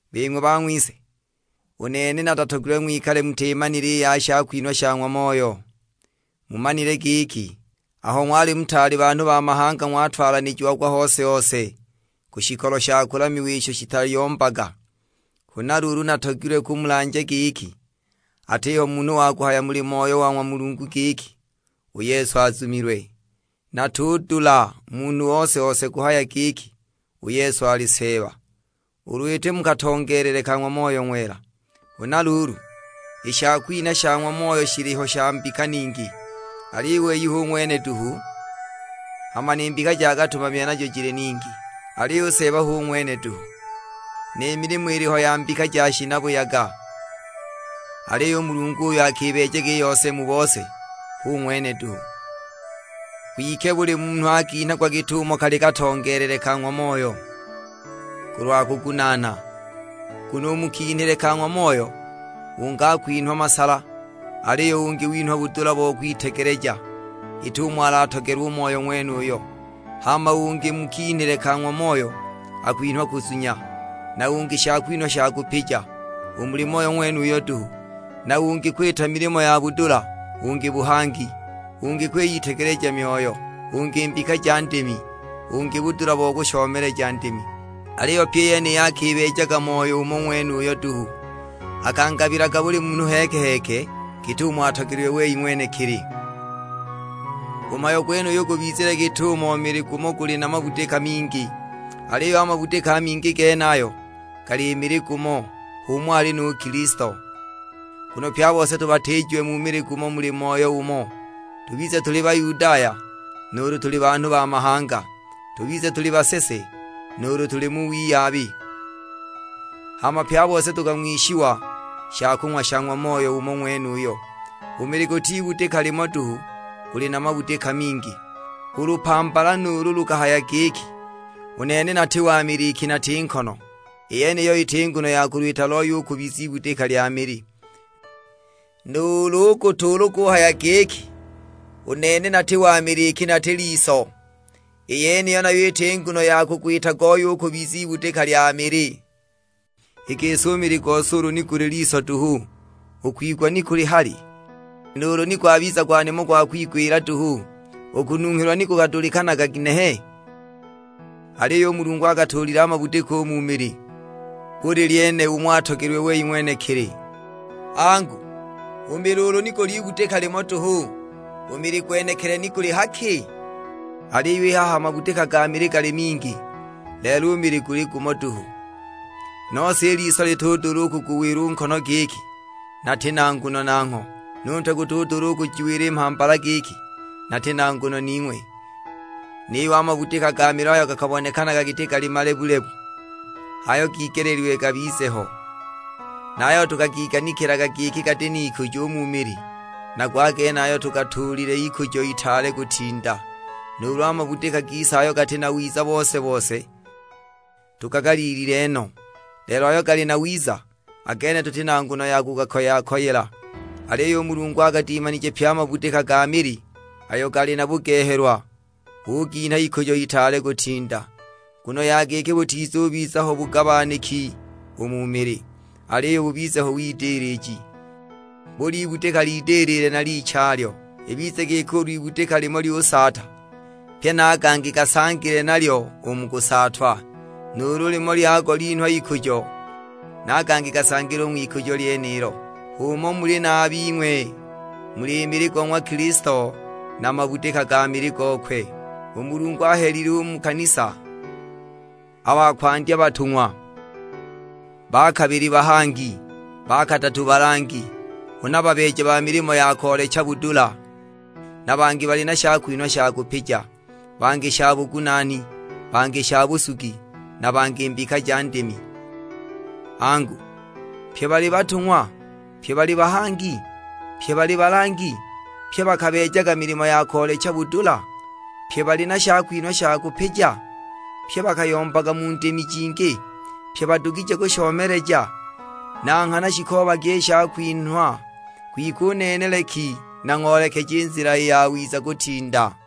Bing'we bang'wise, u nene natatogilwe ng'wikale mutimanile i ya shakwinha sha ng'wa Moyo. Mumanile giki aho ng'wali mutaali banhu ba mahanga ng'watwalanijiagwa hose-hose ku shikolo sha kulamiwa isho shitayombaga. Huna luulu natogilwe kumulanja giki, atiho munhu wa kuhaya muli Moyo wa ng'wa Mulungu giki, "U Yesu azumilwe!" Na atudula munhu ose-ose kuhaya giki, "U Yesu ali Seeba;" ulu iti mu katongeelele ka ng'wa Moyo Ng'wela. Huna luulu, i shakwinha sha ng'wa Moyo shiliho sha mbika ningi, aliyo u wei hu ng'wene duhu. Hama ni mbika ja katumamile najo jili ningi, aliyo u Seeba hu ng'wene duhu. Ni milimo iliho ya mbika ja shinabuyaga, aliyo u Mulungu uyo akibeejaga i yose mu bose, hu ng'wene duhu. Kwike buli munhu akinhagwa git'umo kali katongeelele ka ng'wa Moyo, kulwa kugunaana. Nguno u mu kinhile ka ng'wa Moyo, ungi akwinhwa masala, aliyo ungi winhwa budula bo kwitegeleja, git'umo alatogelwe u Moyo ng'wenuyo. Hama ungi u mu kinhile ka ng'wa Moyo akwinhwa kuzunya, na ungi shakwinhwa sha kupija, u muli Moyo ng'wenuyo duhu. Na ungi kwita milimo ya budula, ungi buhangi, ungi kwiyitegeleja myoyo, ungi mbika ja ndimi, ungi budula bo kushomeleja ndimi. Aliyo pyi i yeniyi akibeejaga Moyo umo ng'wenuyo duhu; akangabilaga buli munhu heeke-heeke git'umo atogelilwe wei ng'wenekili. U mhayo gwenuyu gubizile git'umo mili gumo guli na mabudika mingi, aliyo a mabudika a mingi genayo gali mili gumo; h'umo ali nu Kilisto. Nguno pye a bose tubatiijiwe mu mili gumo muli Moyo umo, tubize tuli Bayudaya, nuulu tuli banhu ba mahanga; tubize tuli basese, nuulu tuli mu wiyabi: hama pye a bose tukang'wishiwa shakung'wa sha ng'wa Moyo umo ng'wenuyo. U mili guti ibudika limo duhu, guli na mabudika mingi. U lupambala nuulu lukahaya giki, "U nene nati wa mili iki nati nkono;" i yeniyo iti nguno ya kulwita looye u kubiza ibudika lya mili. Nuulu u gutu ulu guhaya giki, "U nene nati wa mili iki nati liso," i yeniyo nayo iti nguno ya kugwita gooye u kubiza ibudika lya mili. I gisi u mili u gose ulu ni guli liso duhu, u kwigwa ni kuli hali? Nuulu ni gwabiza gwa nimo gwa kwigwila duhu, u kununghilwa ni gukadulikanaga ginehe? Aliyo u Mulungu agatuulile a mabudika u mu mili, buli lyene umo atogelilwe wei ng'wenekili. Angu, u mili ulu ni guli ibudika limo duhu, u mili gwenekili ni guli ha ki? Aliyo i haha a mabudika ga mili gali mingi, lelo u mili guli gumo duhu. Nose i liso litudula u kuguwila u nkono giki, "Nati na nguno nangho;" nu ntwe gutudula u kujiwila i mhambala giki, "Nati na nguno ning'we." Niyo a mabudika ga mili ayo gakabonekanaga giti gali malebu-lebu, h'ayo gigeleelilwe gabize ho! Na a yayo tukagiganikilaga giki gati n'ikujo u mu mili, nago a genayo tugatuulilile ikujo itaale kutinda. Nuulu a mabudika gise ayo gati na wiza bose-bose, tugagaliilile no; lelo ayo gali na wiza, a gene tuti na nguno ya kugakoya-koyela. Aliyo u Mulungu agadimanije pye a mabudika ga mili: ayo gali na bugehelwa uginha ikujo itaale kutinda. Nguno ya giki butizubiza ho bugabaniki u mu mili, aliyo bubize ho widiliji; buli ibudika lidilile na lichalyo. Ibize giki ulu ibudika limo lyusaata, pye na a gangi gasangile nalyo u mu kusaatwa; nuulu limo lyago linhwa ikujo, na a gangi gasangile u ng'wikujo lyenilo. H'umo muli na a bing'we, muli mili go ng'wa Kilisto, na mabudika ga mili gokwe. U Mulungu ahelile u mu kanisa; a ba kwandya batung'wa, ba kabili bahangi, ba kadatu balangi, huna babeeja ba milimo ya koolecha budula, na bangi bali na shakwinhwa sha kupija, bangi sha bugunaani, bangi sha busugi, na bangi mbika ja ndimi. Angu, pye bali batung'wa? Pye bali bahangi? Pye bali balangi? Pye bakabeejaga milimo ya koolecha budula? Pye bali na shakwinhwa sha kupija? Pye bakayombaga mu ndimi jingi? Pye badugije kushomeleja? Na nghana shikoobagi i shakwinhwa; kwike u nene leki nang'oolekeje i nzila i yawiza kutinda.